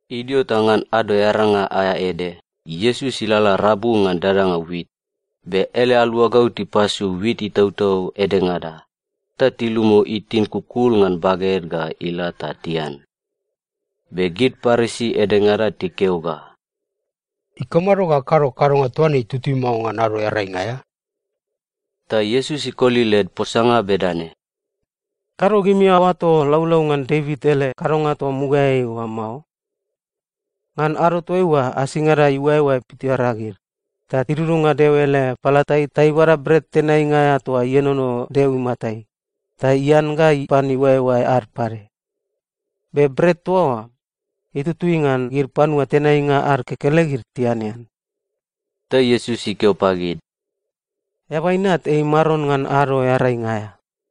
Idio ta ngan Ado Earainga aea ede, Iesus ilalala rabu ngan dadanga wit, be ele aluagau tipasu wit itautau edengada, ta tilumu itin kukul ngan baged ga ila ta tian. Be gid Parisi edengada tikeo ga, “Ikamado ga akado kadonga toa ne itutui mao ngan Ado Earainga aea?” Ta Iesus ikoli led posanga bedane, “Kado gimi aoato laulau ngan Devit ele kadonga toa mugaeai oa mao? Ngan ado toaiua, asingada iuaeoae pitoreagid, ta idudunga Deo ele palatai ta ibada bret tenainga aea toa ienono Deo imatai, ta ian ga ipan iuaeoae ad pade. Be bret toa oa, itutui ngan gid panua tenainga ad kekelegid tianean.” Ta Iesus ikeo pagid, “Eaba Inat ei Maron ngan Ado Earainga aea.”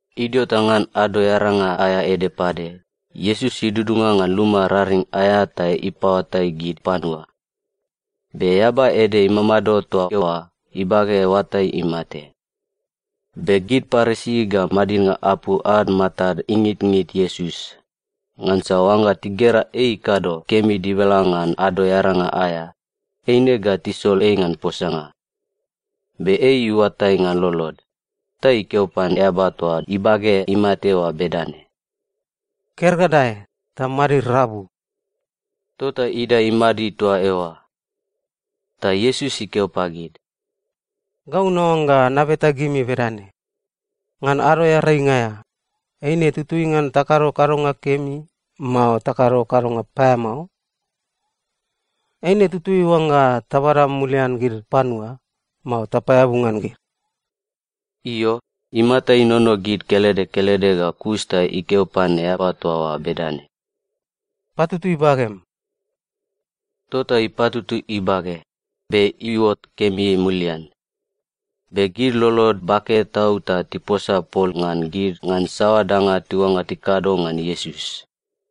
Idio ta ngan Ado Earainga aea ede pade, Iesus idudunga ngan luma raring aea ta ipaoatai gid panua. Be eaba ede imamado toa eoa ibage oatai imate. Be gid Parisi ga madidnga apu ad matad ingitngit Iesus, ngansa oangga tigera ei ikado kemi dibala ngan Ado Earainga aea, eine ga tisol ei ngan posanga. Be ei iuatai ngan lolod, ta ikeo pan eaba toa ibage imate oa bedane, “Ker ga dae, ta madid rabu.” Tota idae imadid toa eoa. Ta Iesus ikeo pagid, “Gau naoangga nabeta gimi bedane: Ngan Ado Earainga aea, eine tutui ngan takado kadonga kemi, mao takado kadonga paeamao? Eine tutui oangga tabada mulian gid panua, mao tapaeabu ngan gid?” Io, imata inono gid kelede kelede ga kus ta ikeo pan eaba toa oa bedane, “Patutui bagem.” Tota ipatutui ibage, be iuot kemi mulian. Be gid lolod bake tau ta tiposa pol ngan gid ngan saoa danga tiuangga tikado ngan Iesus.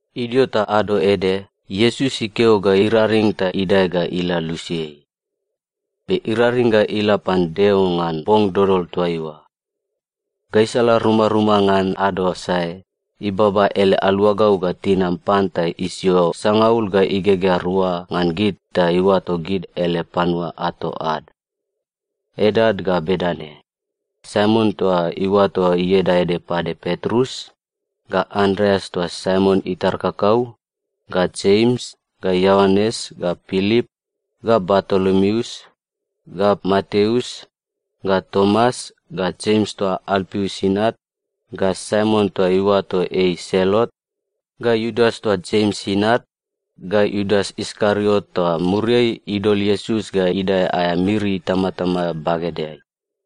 Idio ta ado ede, Iesus ikeo ga iraring ta idae ga ila lusiai. Be iraring ga ila pan Deo ngan bong dodol toaiua. Gaisala rumaruma ngan ado sae, ibaba ele aluagau ga tinam pan ta isio sangaul ga igegea rua ngan gid ta iuato gid ele panua ato ad. Edad ga bedane: Saimon toa iuato ieda ede pade Petrus, ga Andreas toa Saimon itar kakau, ga Jems, ga Ioanes, ga Pilip, ga Bartolomeus, ga Mateus, ga Tomas, ga Jems toa Alpius inat, ga Saimon toa tiuato ei Selot, ga Iudas toa Jems inat, ga Iudas Iskariot toa muriai idol Iesus ga idae aea miri itamatama bagedeai.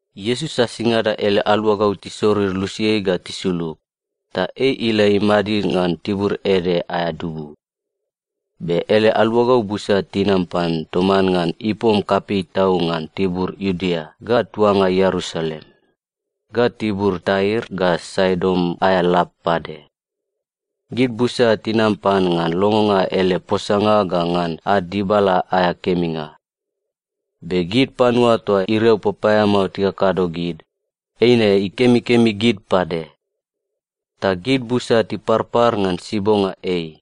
Iesus asingada ele aluagau tisorir lusiai ga tisulug, ta ei ila imadid ngan tibur ede aea dubu. Be ele aluagau busa tinam pan toman ngan ipom kapei tau ngan tibur Iudea ga tuanga Ierusalem, ga tibur Tair ga Saidon aea lab pade. Gid busa tinam pan ngan longonga ele posanga ga ngan ad dibala aea keminga. Be gid panua toa iriau papaeamao tikakado gid, eine ikemikemi gid pade. Ta gid busa tiparpar ngan sibonga ei,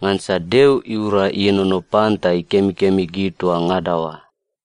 ngansa Deo iura ienono pan ta ikemikemi gid toa ngada oa.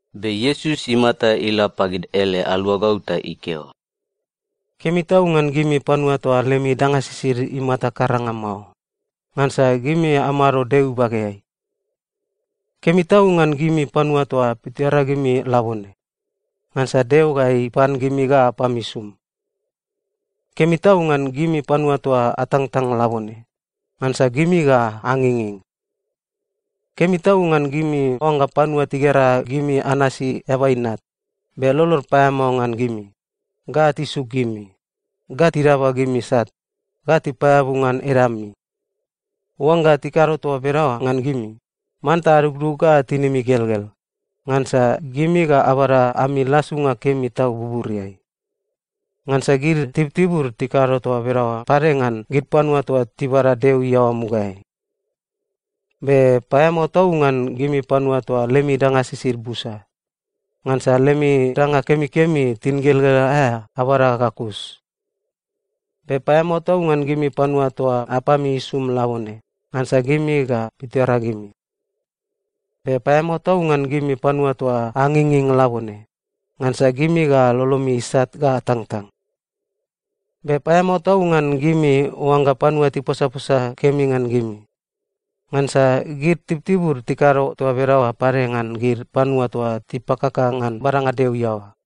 Be Iesus imata ila pagid ele aluagau ta ikeo, “Kemi tau ngan gimi panua toa lemi danga sisid imata karanga mao! Ngansa gimi amado Deo ibageai. Kemi tau ngan gimi panua toa pitoreagimi labone! Ngansa Deo ga ipan gimi ga apami isum. Kemi tau ngan gimi panua toa atangtang labone! Ngansa gimi ga anginging. Kemi tau ngan gimi oangga panua tigera gimi anasi Eaba Inat, be lolod paeamao ngan gimi, ga tisuk gimi, ga tidaba gimi sat, ga tipaeabu ngan edami. “Oangga tikado toa bedaoa ngan gimi, manta adugdug ga tinimi igelgel, ngansa gimi ga abada ami lasunga kemi tau buburiai. Ngansa gid tibutibud tikado toa bedaoa pade ngan gid panua toa tibada Deo iaoa mugaeai. “Be paeamao tau ngan gimi panua toa lemi danga sisid busa! Ngansa lemi danga kemikemi tingelgel aea, abada ga kus. Be paeamao tau ngan gimi panua toa apami isum labone! Ngansa gimi ga pitoreagimi. Be paeamao tau ngan gimi panua toa anginging labone! Ngansa gimi ga lolomi isat ga atangtang. Be paeamao tau ngan gimi oangga panua tiposaposa kemi ngan gimi! Ngansa gid tibutibud tikado toa bedaoa pade ngan gid panua toa tipakaka ngan badanga Deo iaoa.”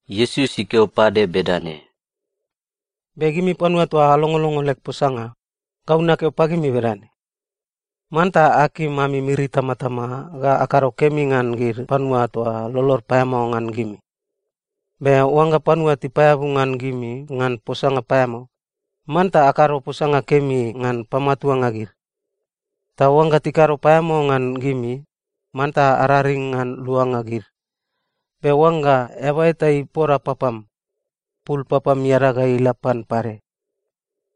Iesus ikeo pade bedane, “Be gimi panua toa alongolongo leg posanga, gau nakeo pagimi bedane: Manta akim ami miri itamatama ga akado kemi ngan gid panua toa lolod paeamao ngan gimi. Be oangga panua tipaeabu ngan gimi ngan posanga paeamao, manta akado posanga kemi ngan pamatuanga gid. Ta oangga tikado paeamao ngan gimi, manta araring ngan luanga gid. Be oangga eaba eta ipoda papam, pul papam iadag ga ila pan pade.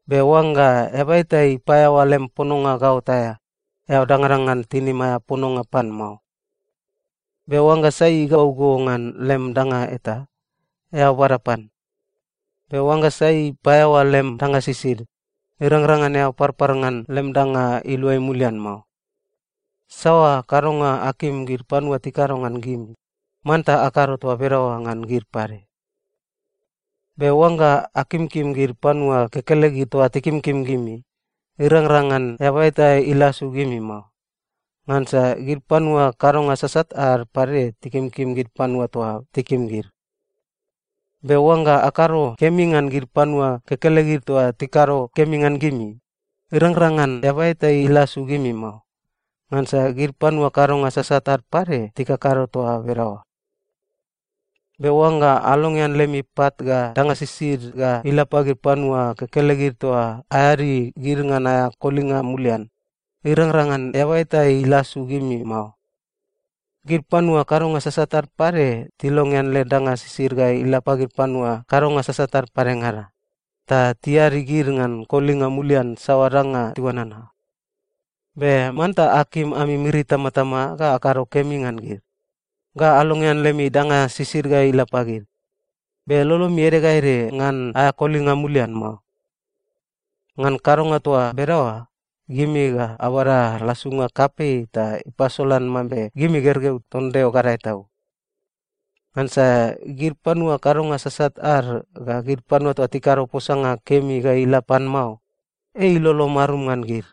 Be oangga eaba eta ipaeaoa lem pononga gaot aea, eao dangadangan tinim aea pononga pan mao. Be oangga sai igau go ngan lem danga eta, eao bada pan. Be oangga sai ipaeaoa lem danga sisid, irangrang ngan eao parpar ngan lem danga iluai mulian mao. Saoa kadonga akim gid panua tikado ngan gimi, manta akado toa bedaoa ngan gid pade. “Be oangga akimkim gid panua kekelegid toa tikimkim gimi, irangrang ngan eaba eta ilasu gimi mao. Ngansa gid panua kadonga sasat ad pade tikimkim gid panua toa tikim gid. Be oangga akado kemi ngan gid panua kekelegid toa tikado kemi ngan gimi, irangrang ngan eaba eta ilasu gimi mao. Ngansa gid panua kadonga sasat ad pade tikakado toa bedaoa. Be oangga alongean lemi pat ga danga sisid ga ila pagid panua kekelegid toa aeadi gid ngan aea kolinga mulian, irangrang ngan eaba eta ilasu gimi mao. Gid panua kadonga sasat ad pade tilongean led danga sisid ga ila pagid panua kadonga sasat ad padengada, ta tiadi gid ngan kolinga mulian saoa danga tiuanana. Be manta akim ami miri itamatama ga akado kemi ngan gid, ga alongean lemi danga sisid ga ila pagid, be lolomi ede ga ede ngan aea kolinga mulian mao. Ngan kadonga toa bedaoa, gimi ga abada lasunga kapei ta ipasolan mambe gimi gergeu ton Deo Gadae Tau. Ngansa gid panua kadonga sasat ad ga gid panua toa tikado posanga kemi ga ila pan mao, ei ilolo marum ngan gid.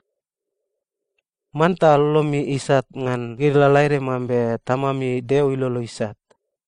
Manta lolomi isat ngan gid lalaede mambe Tamami Deo ilolo isat.”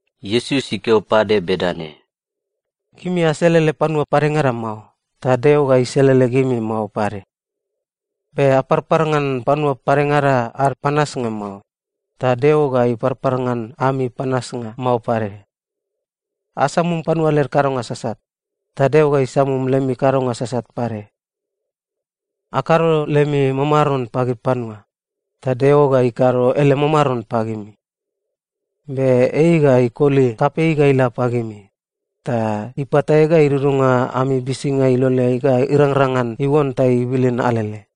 Iesus ikeo pade bedane, “Gimi aselele panua padengada mao, ta Deo ga iselele gimi mao pade. Be aparpar ngan panua padengada ad panasnga mao, ta Deo ga iparpar ngan ami panasnga mao pade. Asamum panua led kadonga sasat, ta Deo ga isamum lemi kadonga sasat pade. Akado lemi mamaron pagid panua, ta Deo ga ikado ele mamaron pagimi. Be ei ga ikoli kapei ga ila pagimi, ta ipatae ga idudunga ami bisinga iloleai ga irangrang ngan iuon ta ibilin alele.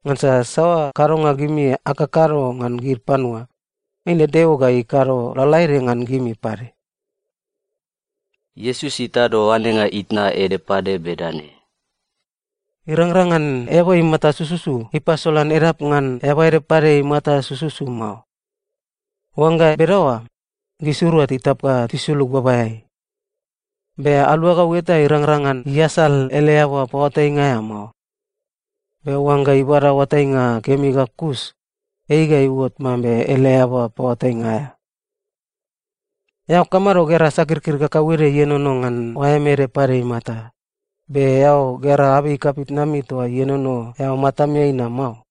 Ngansa saoa kadonga gimi akakado ngan gid panua, eine Deo ga ikado lalaede ngan gimi pade.” Iesus itado oanenga itna ede pade bedane, “Irangrang ngan eaba imata sususu ipasolan edap ngan eaba ede pade imata sususu mao. Oangga bedaoa, gisirua titap ga tisulug babaeai. Be aluagau eta irangrang ngan iasal ele eaba paoatainga aea mao. Be oangga ibada oatainga kemi ga kus, ei ga iuot mambe ele eaba paoatainga aea. “Eao kamado gera sakirkir kakauede ienono ngan oaem ede pade imata, be eao gera abei kapitnami toa ienono eao matameai na mao?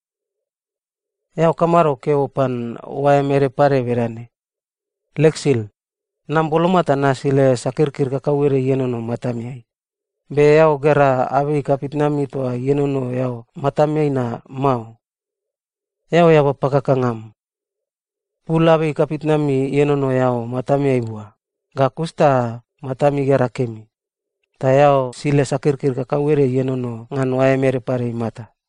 Eao kamado keo pan oaem ede pade bedane, ‘Leg sil, nam boloma ta nasile sakirkir kautede ienono matameai,’ be eao gera abei kapitnami toa ienono eao matameai na mao? Eao eaba pakakanga am! Pul abei kapitnami ienono eao matameai bua, ga kus ta matam igera kemi, ta eao sile sakirkir kakauede ienono ngan oaem ede pade imata.”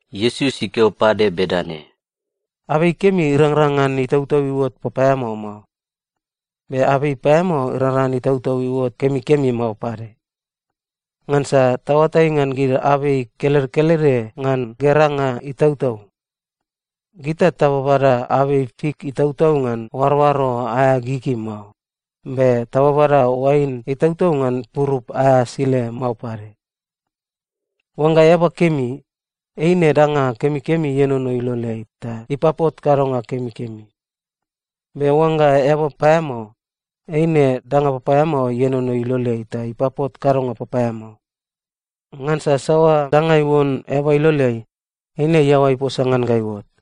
Iesus ikeo pade bedane, “Abei kemi irangrang ngan itautau iuot papaeamao mao. Be abei paeamao irangrang ngan itautau iuot kemikemi mao pade. Ngansa taoatai ngan gid abei kelede kelede ngan geranga itautau. Gita tababada abei fik itautau ngan oaroaro aea gigi mao, be tababada oain itautau ngan purup aea asile mao pade. Oangga eaba kemi, eine danga kemikemi ienono iloleai ta ipapot kadonga kemikemi. Be oangga eaba paeamao, eine danga papaeamao ienono iloleai ta ipapot kadonga papaeamao. Ngansa saoa danga iuon eaba iloleai, eine iaoa iposa ngan ga iuot.”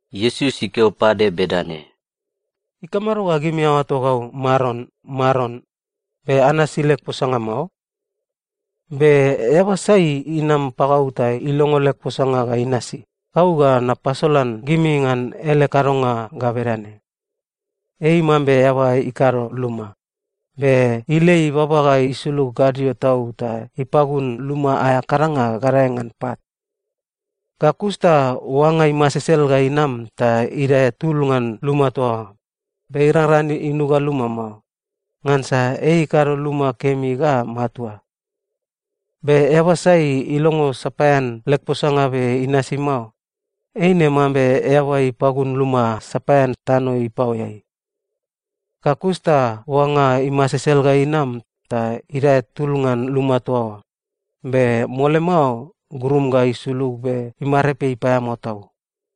Iesus ikeo pade bedane, “Ikamado ga gimi aoato gau, ‘Maron, Maron,’ be anasi leg posanga mao? Be eaba sai inam pagau ta ilongo leg posanga ga inasi, gau ga napasolan gimi ngan ele kadonga ga bedane: Ei mambe eaba ikado luma, be ilei baba ga isulug gadio tau ta ipagun luma aea kadanga gadae ngan pat. Ga kus ta oanga imasesel ga inam ta idae tul ngan luma toa oa, be irangrang ngan inuga luma mao, ngansa ei ikado luma kemi ga matua. Be eaba sai ilongo sapaean leg posanga be inasi mao, eine mambe eaba ipagun luma sapaean tano ipaoeai. Ga kus ta oanga imasesel ga inam ta idae tul ngan luma toa oa, be mole mao grum ga isulug be imarepei paeamao tau.”